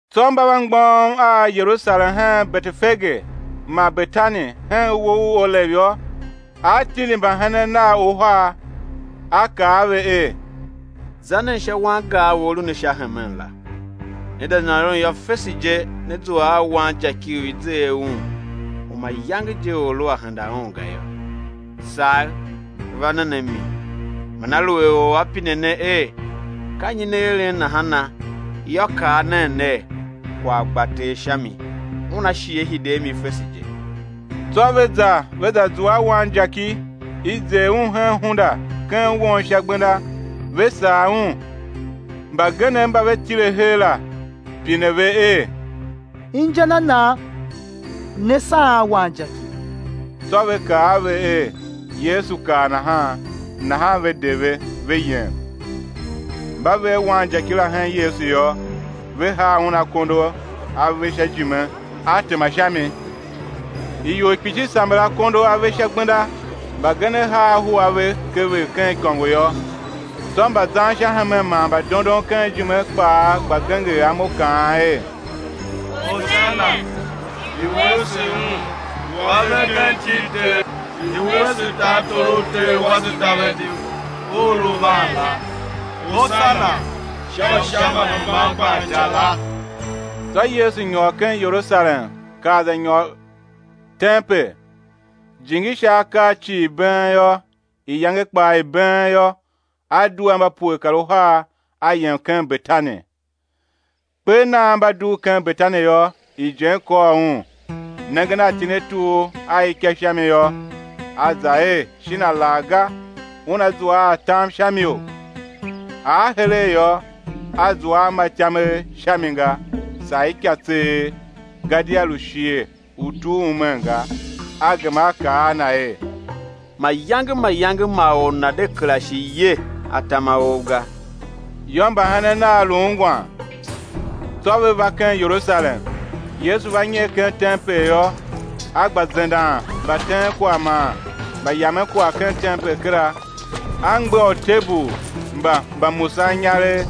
Tsô mba va mgbôghom a Yerusalem hen Betefage man Betani hen uwo u Olev yô, A tindi mbahenen Nav uhar, A kaa a ve er: Za nen sha wangar u a lu ne sha hemen la; né za nyôron yô, fese je né zua a wanjaki u i zer un u mayange je or lu a henda un ga yô. Sagh, va nen a mi. Man aluer or a pine ne er: Ka nyi ne eren nahana, yô, kaa nen ner: Kwagh gba Ter sha mi, Una shi Á hide a mi fese je. Tsô ve za, ve za zua a wanjaki, i zer un hen hunda ken won sha gbenda, ve sagh un. Mbagenev mba ve tile her la, pine ve er: Inja na nan ne saghen wanjaki? Tsô ve kaa ve er Yesu kaa nahan; nahan ve de ve, ve yem. Mba ve a wanjaki la hen Yesu yô, ve haa un akondo a ve sha ijime, A tema sha mi. Ior kpishi samber akondo a ve sha gbenda, mbagenev haa ahu a ve kever ken ikôngo yô. Tsô, mbazan sha hemen man mbadondon ken ijime kpaa, gba genger amo kaan er: Hosana! I̱ wuese Un u A ve ken iti i Ter. I̱ wuese tartor u ter wase Davidi u u lu van la; Hosana sha Usha mba hemban gban ica la! Tsô Yesu nyôr ken Yerusalem kar za nyôr ken tempel; jingi sha akaa cii been yô, iyange kpaa i been yô, a due a mba pue kar uhar, A yem ken Betani. Kper nan, mba dugh ken Betani yô, ijen kôr Un. Nengen a itinetur a ika sha mi yô, A za er, shin alaghga Una zua a atam sha miou? Ar heregh yô, A zua a ma ityamegh sha mi ga, saa ika tseegh; gadia lu shighe u tur umen ga. A gema A kaa a na er: Mayange mayange ma or nana̱ de kera shi ye atam a ou ga. Yô, mbahenen Nav lu ungwan. Tsô ve va ken Yerusalem. Yesu va nyer ken tempel yô, A gba zendan mbateenkwagh man mbayamenkwagh ken tempel kera, A mgbegha utebul mba mbamusaninyaregh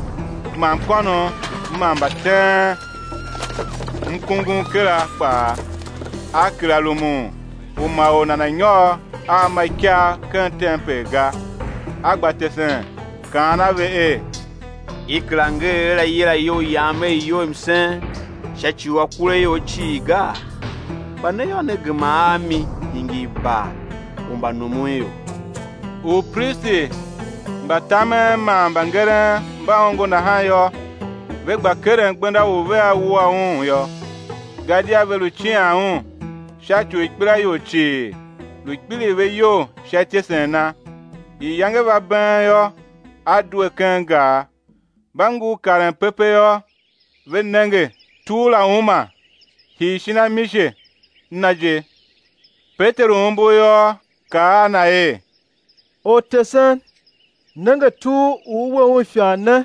man mkônom ma mbateenmkungum kera kpaa. A kera rumun u ma or nana̱ nyôr a ma ikagh ken tempel ga. A gba tesen kaan a ve er: I kera nger er: Á yila iyou Yam er iyou i msen sha ci u akuraior cii gaa? Kpa ne yô, ne gema a mi, hingir bar u mbanumunior. Upristi mba tamen man mbangeren mba ongo nahan yô, ve gba keren gbenda u vea wua Un yô; gadia ve lu cian Un, sha ci u ikpelaior cii, lu kpiligh ve iyol sha ityesen Na. Iyange va been yô, A due ken gar. Mba ngur karen pepe yô, ve nenge tur la uma, hii shin amise na je. Peteru umbur yô, kaa a Na er: Ortesen, nenge tur u U we un ifan ne,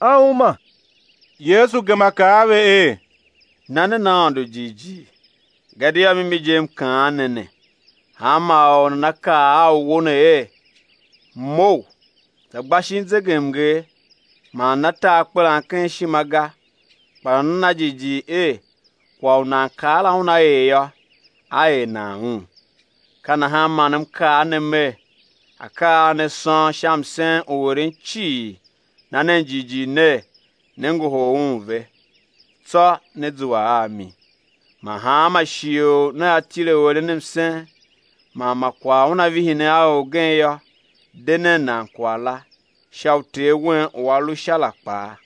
a uma. Yesu gema kaa a ve er: Na nen Aôndo jighjigh. Gadia mimi je, M kaan ne ne, hanma or u nana kaa a uwo ne er: Mough, za gba shin zegemnger man nana ta akpelan ken ishima ga, kpa nana na jighjigh er kwagh u nan kaa la una er yô, á er nan un. Ka nahan man M kaa ne Mer: Akaa a ne sôn sha msen u eren cii, na nen jighjigh ner, ne ngohol un ve, tsô né zua a mi. Man hanma shighe u nea tile u eren msen, man ma kwagh una vihi ne a orgen yô, de nen nan kwagh la, sha u Ter wen u A lu Sha la kpaa,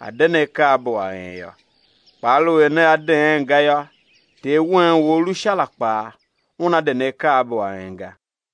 A̱ de ne akaabo a en yô. Kpa aluer nea deen ga yô, Ter wen u A lu Sha la kpaa Una de ne akaabo a en ga.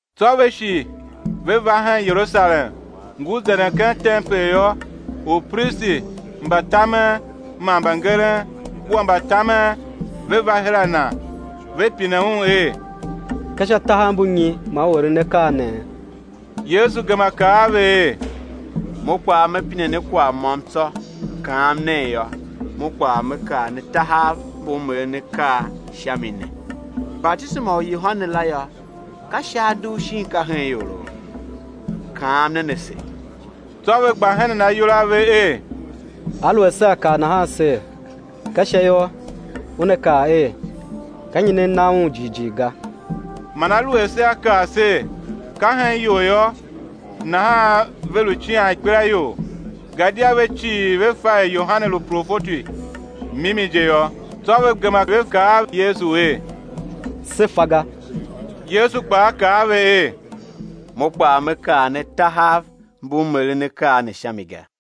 Tsô ve shi ve va hen Yerusalem, Ngur zenden ken tempel yô, upristi mba tamen man mbangeren kua mbatamen ve va her a Na, ve pine Un er: Ka sha tahav mbu nyi man U eren akaa ne? Yesu gema kaa a ve er: Mo kpaa Me pine ne kwagh môm tsô, kaam nen, yô, Mo kpaa Me kaa ne tahav mbu M eren akaa sha mi ne. Batisema u Yohane la yô, ka Sha a dugh shin ka hen ioro? Kaam nen ase! Tsô ve gba henen ayol a ve er: Aluer sea kaa nahan ser, ka Sha yô, Una kaa er: Ka nyi ne na un jighjigh ga? Man aluer sea kaa ser: Ka hen ior yô, nahan ve lu cian ikpelaior, gadia ve cii ve fa er Yohane lu profeti mimi je yô. Tsô ve gema ve kaa a Yesu er: Se fa ga. Yesu kpaa kaa a ve er: Mo kpaa Me kaa ne tahav mbu M eren akaa ne sha mi ga.